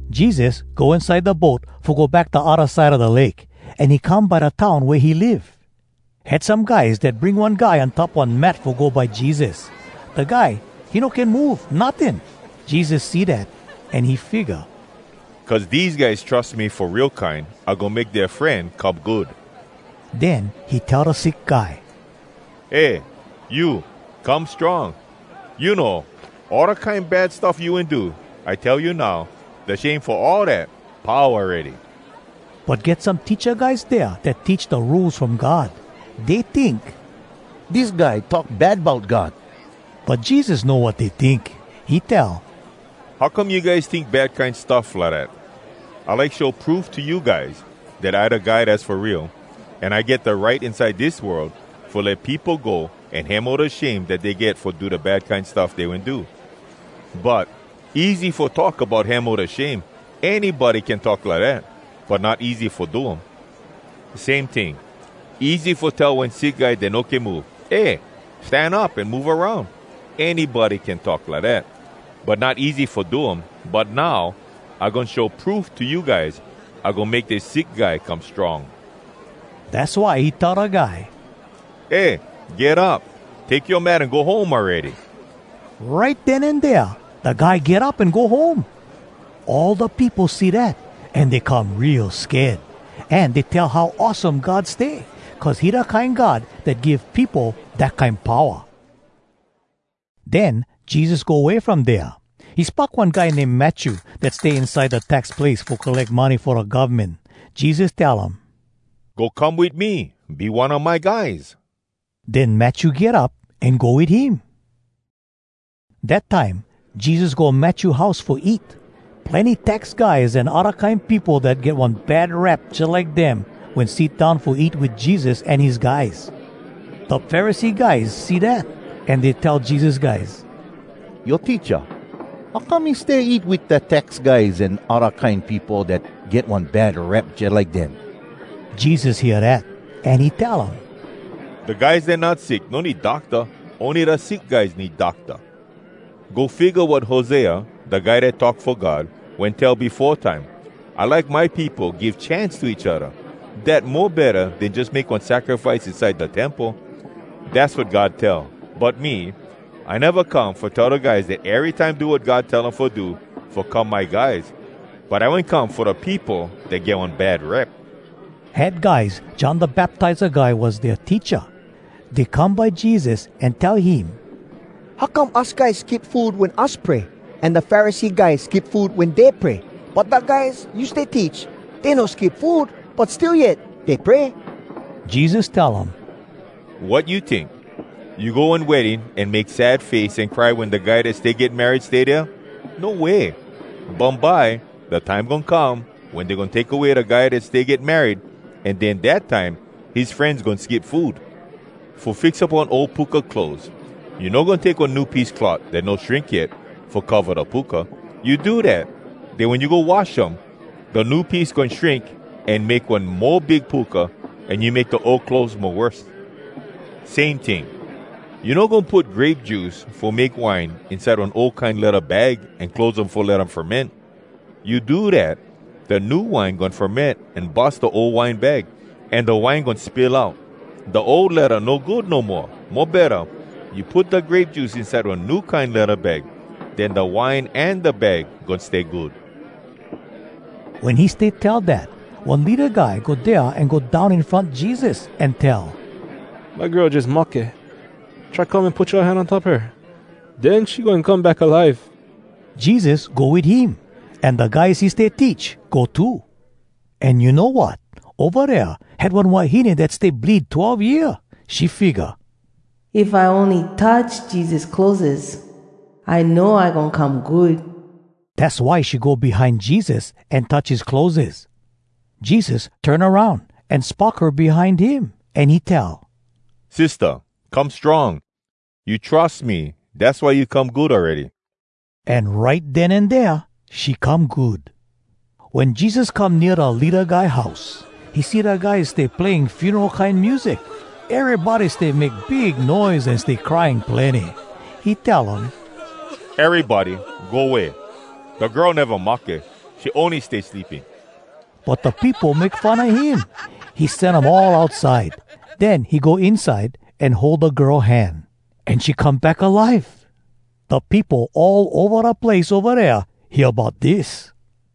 Jesus go inside da boat fo go back da odda side a da lake, an he come by da town wea he live. Had some guys dat bring one guy on top one mat fo go by Jesus. Da guy, he no can move, notting. Jesus see dat, an he figga, “Cuz dese guys trus me fo real kine, I goin make dea fren come good!” Den he tell da sick guy, “Eh, you, come strong! You know all da kine bad stuff you wen do? I tell you now, da shame fo all dat, pau awready!” But get some teacha guys dea dat teach da Rules From God. Dey tink, “Dis guy talk bad bout God!” But Jesus know wat dey tink. He tell, “How come you guys tink bad kine stuff lidat? I like show proof to you guys, dat I da Guy Dass fo Real, an I get da right inside dis world fo let peopo go an hemo da shame dat dey get fo da bad kine stuff dey wen do. But, easy fo talk bout hemo da shame—anybody can talk lidat. But not easy fo do um. Same ting, easy fo tell one sick guy dat no can move, ‘Eh, stan up an move aroun!’—anybody can talk lidat. But not easy fo do um. But now, I goin show proof to you guys—I goin make dis sick guy come strong.” Dass why he tell da guy, “Eh, get up! Take yoa mat an go home awready!” Right den an dea, da guy get up an go home. All da peopo see dat, an dey come real sked. An dey tell how awesome God stay, cuz he da kine God dat give peopo dat kine powa. Den Jesus go way from dea. He spock one guy name Matthew, dat stay inside da tax place fo colleck money fo da govmen. Jesus tell um, “Go come wit me! Be one a my guys!” Den Matthew get up, an go wit him. Dat time Jesus go Matthew house fo eat. Plenny tax guys an odda kine peopo dat get one bad rep jalike dem wen sit down fo eat wit Jesus an his guys. Da Pharisee guys see dat, an dey tell Jesus guys, “Yoa teacha, how come he stay eat wit da tax guys an odda kine peopo dat get one bad rep jalike dem?” Jesus hear dat, an he tell um, “Da guys dat not sick no need docta, ony da sick guys need docta. Go figga wat Hosea, da guy dat talk fo God, wen tell befo time, ‘I like my peopo give chance to each odda. Dat mo betta den jus make one sacrifice inside da temple.’ Dass wat God tell. But me, I neva come fo tell da guys dat erytime do wat God tell um fo do, fo come my guys, but I wen come fo da peopo dat get one bad rep.” Had guys John Da Baptiza Guy was dea teacha. Dey come by Jesus, an tell him, “How come us guys skip food wen us pray, an da Pharisee guys skip food wen dey pray, but da guys you stay teach, dey no skip food, but still yet dey pray?” Jesus tell um, “Wat you tink? You go one wedding an make sad face an cry wen da guy dat stay get married stay dea? No way! Bumbye, da time goin come wen dey goin take away da guy dat stay get married, an den, dat time, his frenz goin skip food. “Fo fix up one ol puka clothes, you no goin take one new piece cloth dat no shrink yet fo cova da puka. You do dat, den wen you go wash um, da new piece goin shrink an make one mo big puka, an you make da ol clothes mo worse. Same ting, you no goin put grape juice fo make wine inside one ol kine ledda bag an close um fo let um ferment. You do dat, da new wine goin ferment an bus da ol wine bag, an da wine goin spill out. Da ol ledda no good no moa. Mo betta, you put da grape juice inside one new kine ledda bag. Den da wine an da bag goin stay good.” Wen he stay tell dat, one leada guy go dea an go down in front Jesus, an tell, “My girl jus mahke. Try come an put yoa hand on top her. Den she goin come back alive.” Jesus go wit him, an da guys he stay teach go too. An you know wat? Ova dea, had one wahine dat stay bleed twelve year. She figga, “If I ony touch Jesus clotheses, I know I goin come good.” Dass why she go behind Jesus, an touch his clotheses. Jesus turn aroun, an spock her behind him, an he tell, “Sistah, come strong! You trus me, dass why you come good awready.” An right den an dea she come good. Wen Jesus come nea da leada guy house, he see da guys stay playing funeral kine music. Erybody stay make big noise an stay crying plenny. He tell um, “Erybody go way! Da girl neva mahke, she ony stay sleeping.” But da peopo make fun a him. He sen um all outside. Den he go inside, an hold da girl hand, an she come back alive. Da peopo all ova da place ova dea hear bout dis.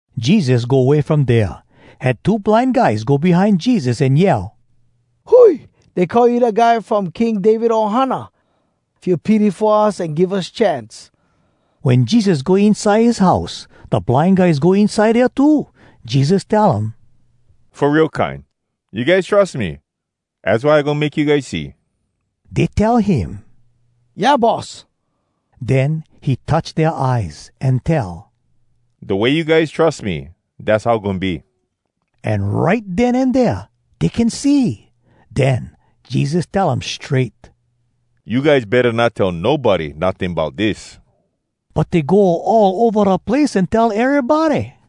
Jesus go way from dea. Had two blind guys go behind Jesus an yell, “Hui! Dey call you Da Guy From King David Ohana! Feel pity fo us an give us chance!” Wen Jesus go inside his house, da blind guys go inside dea too. Jesus tell um, “Fo real kine, you guys trus me, az why I goin make you guys see?” Dey tell him, “Yeah, Boss.” Den he touch dea eyes an tell, “Da way you guys trus me, dass how goin be.” An right den an dea dey can see. Den Jesus tell um strait, “You guys betta not tell nobody notting bout dis.” But dey go all ova da place an tell erybody.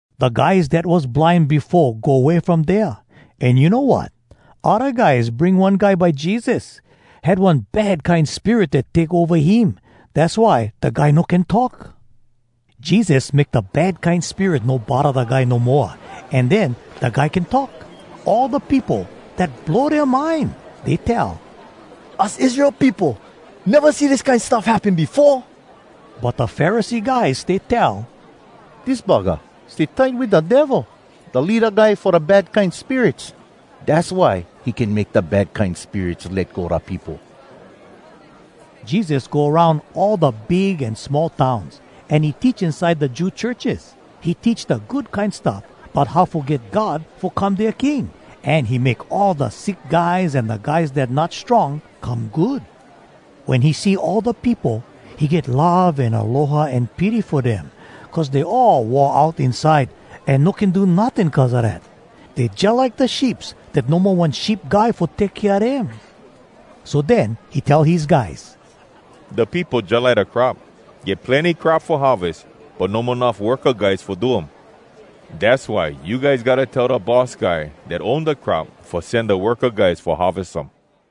Da guys dat was blind befo go way from dea. An you know wat? Odda guys bring one guy by Jesus. Had one bad kine spirit dat take ova him, dass why da guy no can talk. Jesus make da bad kine spirit no bodda da guy no moa, an den da guy can talk. All da peopo, dat blow dea mind. Dey tell, “Us Israel peopo neva see dis kine stuff happen befo!” But da Pharisee guys stay tell, “Dis buggah stay tight wit da Devil, da leada guy fo da bad kine spirits. Dass why he can make da bad kine spirits let go da peopo!” Jesus go aroun all da big an small towns, an he teach inside da Jew churches. He teach da Good Kine Stuff bout how fo get God fo come dea King, an he make all da sick guys an da guys dat not strong come good. Wen he see all da peopo, he get love an aloha an pity fo dem, cuz dey all wore out inside an no can do notting cuz a dat. Dey jalike da sheeps dat no mo one sheep guy fo take kea dem. So den he tell his guys, “Da peopo jalike da crop. Get plenny crop fo harves, but no mo enuff worka guys fo do um. Dass why you guys gotta tell da boss guy dat own da crop fo sen da worka guys fo harves um.”